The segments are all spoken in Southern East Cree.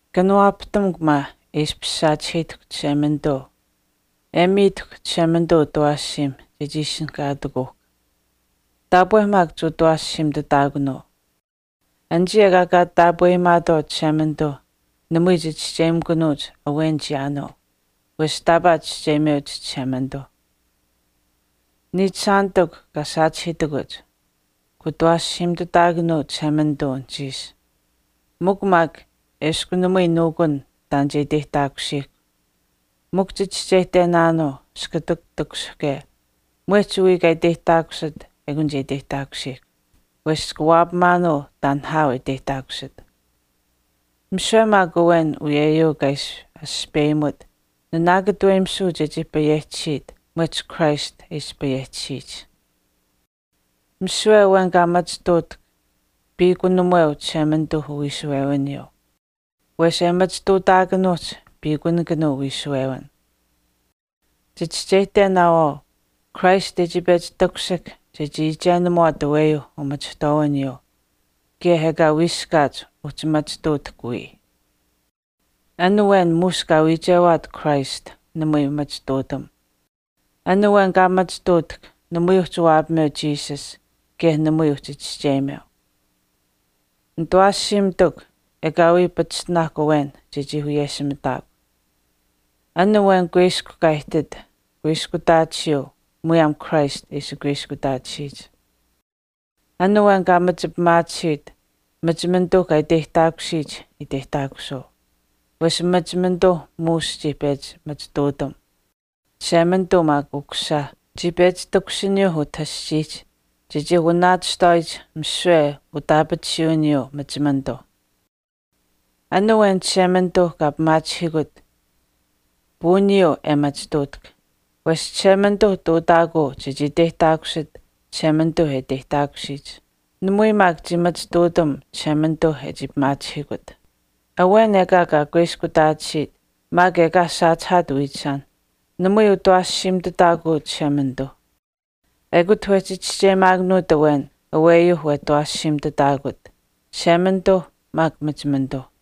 Kanawaapahtamukw maa e ishpish saachihiitahkw Chishemanituu e miitahkw Chishemanituu utawaashiim chechii ishinihkaatakuuhkw. Taapwe maak kuutawaashiimitutaakunuu. Anichii ekaa kaa taapweyimaatwaau Chishemanituu namui chichischeyimikunuuch awenich chiyaanuu wesh taapaa chischeyimeuch Chishemanituu. Niichishaanitikw kaa saachihiitakuch, kuutawaashiimitutaakunuu Chishemanituu anuhchiish, mikw maak eshkw namui nuukun taan che iteyihtaakusiihkw, mikw chichischeyihtenaanuu iskutak takushihke mwehch wiya kaa iteyihtaakusit ekun che iteyihtaakusiihkw. Wesh chika waapamaanuu taan nihaau e iteyihtaakusit. Misiwe maak awen uyeyuu kaa ishi aspeyimut nanaakataweyimisuu chechii payehchisiit mwehch Christ e ishi payehtisiyich. Misiwe awen kaa machituutahk, piikunamuweu Chishemanituuh uwiishuwewiniyuu. Wesh e machituutaakanuuhch piikunikanuu wiishuwewin. Chichischeyihtenaawaau Christ e chii pechi takushihk chechii iichenamuwaat aweyuu umachihtwaawiniyuuh kaye ekaa wiiskaat uhchi machituutahk wiya. An awen muush kaa wiichewaat Christ namui machituutam. An awen kaa machituutahk namui uhchi waapameu Jesus kaye namui uhchi chischeyimeu. Nitawaashiimitikw, ekaawii pachishtinaahkw awen chechii wiyeshimitaakw. An awen kuiskw kaa ihtit kuiskutaatisiyuu muyaam Christ e ishi kuiskutaatisiyich. An awen kaa machipimaatisiit machimanituu kaa iteyihtaakusiyich iteyihtaakusuu. Wesh machimanituu muush chii pechi machituutam. Chishemanituu maak Ukusisa chii pechi takushiniyuu utah aschiihch chechii wanaachihtaawaayich misiwe utaapatisuwiniyuu machimanituu. An awen Chishemanituu kaa pimaachihiikut puuniyuu e machituutahk. Wesh Chishemanituu ihtuutaakuu chechii iteyihtaakusit Chishemanituu e iteyihtaakusiyich. Namui maak chii machituutam Chishemanituuh e chii pimaachihiikut. Awen ekaa kaa kuiskutaatisiit maak ekaa saachihaat wiichishaan, namui utawaashiimitutaakuu Chishemanituuh. Ekut wehchi chischeyimaakanuut awen aweyuu wetawaashiimitutaakut, Chishemanituu maak machimanituu.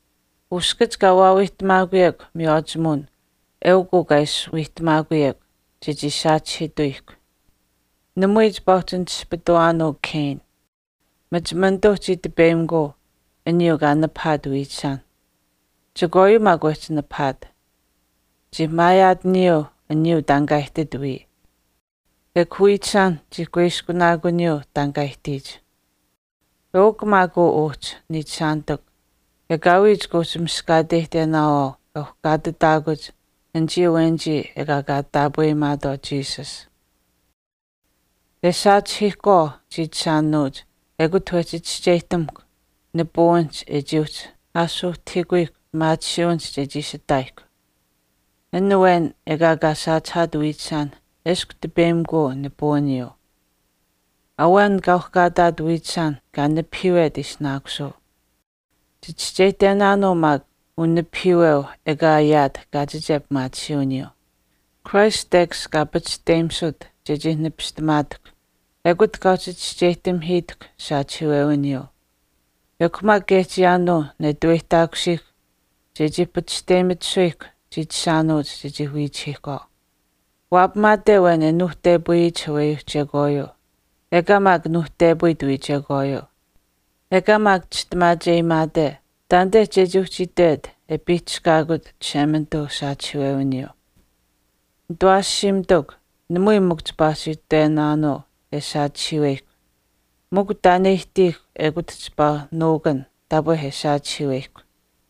Uskach kaa waawiihtamaakuyekw miywaachimuwin eukw uu kaa ishi wiihtamaakuyekw, chechii saachihiituyihkw. Namui chipaa uhchi naspituwaanuu Cain. Machimanituuh chii tipeyimikuu aniyuu kaa nipahaat wiichishaan. Chekwaayuu maak wehchii nipahaat. Chii maayaataniyuu aniyuu taan kaa ihtit wiya, chii kuiskunaakuniyuu maak wii aniyuu taan kaa ihtiyich wiichishaan. Eukw maak uu uhchi, niichishaanitikw, ekaawii chika uhchi miskaateyihtenaawaau e uhkaatitaakuch anichii awenichii ekaa kaa taapweyimaatwaau Jesus. E saachihiihkwaau chiichishaanuuch ekut wehchi chischeyihtamukw nipuwinihch e chii uhchi aashuuhtahiikuyihkw pimaatisiiwinihch chechii ishi ihtaayihkw. Awen ekaa kaa saachihaat wiichishaan eshkw tipeyimikuu nipuwiniyuu. Awen kaa uhkaataat wiichishaan kaa nipahiiwet ishinaakusuu. Chichischeyihtenaanuu maak unipahiiweu ekaa e ayaat kaachiche pimaatisiiwiniyuu. Christ tekash kaa pachishteyimut chechii nipistamaatahkw ekut kaa uhchi chischeyihtamihiitahkw saachihiiwewiniyuu. Ekw maak kaye chiyaanuu netuweyihtaakusiihkw chechii pachishteyimitisuyihkw chiichishaanuuch chechii wiichihiihkwaau. Waapamaate awen e nuuhtepayiyich aweyuuh chekwaayuu, ekaa maak nuuhtepayit wiya chekwaayuu, ekaa maak chistimaacheyimaate, taanite chechii uhchi itwet e piihchishkaakut Chishemanituu usaachihiiwewiniyuu. Nitawaashiimitikw, namui mikw chipaa uhchi itwenaanuu e saachihiiweyihkw. Mikw taan e ihtiihkw ekut chipaa nuukun taapwe e saachihiiweyihkw.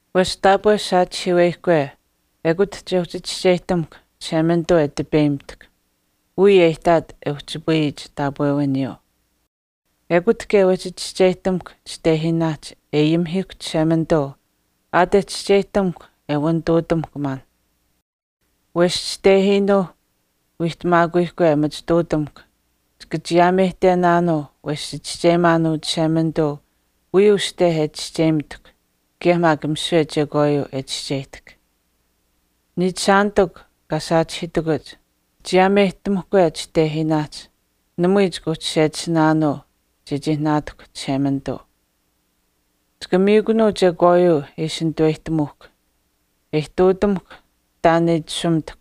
Wesh taapwe saachihiiweyihkwe ekut che uhchi chischeyihtamuhkw Chishemanituu e tipeyimitahkw wiya e ihtaat wehchipayiyich taapwewiniyuu. Ekut kaye wehchi chiyaameyihtamuhkw chitehiinaahch e ayimihiihkw Chishemanituu aat e chischeyihtamukw e wanituutamuhkw maanh. Wesh chitehiinuu wiihtamaakuyihkwe e machituutamuhkw Chika chiyaameyihtenaanuu wesh chichischeyimaanuu Chishemanituu wiya uste e chischeyimitahk kaye maak misiwe chekwaayuu e chischeyihtahk. Niichishaanitikw kaa saachihiitakuch chiyaameyihtamuhkwe chitehiinaahch namui chika uhchi sechisinaanuu chechii naatahkw Chishemanituu. Chika miikunuu chekwaayuu e ishi nitaweyihtamuuhkw, e ihtuutamuhkw taan e itashumitahkw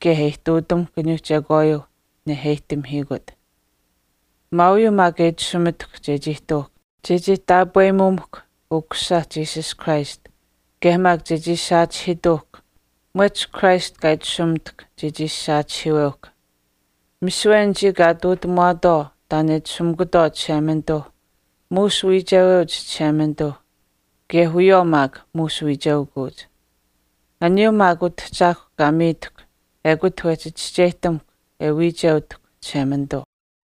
kaye e ihtuutamuhkw aniyuu chekwaayuuh neheyihtamihiikut. Maauyuu maak e itashumitahkw chechii ihtuuhkw, chechii taapweyimuumuhkw Ukusisa Jesus Christ kaye maak chechii saachihiituuhkw mwehch Christ kaa itashumitahkw chechii ishi saachihiiweuhkw. Misiwe anichii kaa ihtuutamuwaatwaau taan e itashumikutwaau Chishemanituuh muush wiicheweuch Chishemanituuh kaye wiyawaau maak muush wiicheukuuch. Aniyuuh maak Utahchaahkw kaa miitakw ekut wehchi chischeyihtamuhkw e wiicheutahkw Chishemanituu.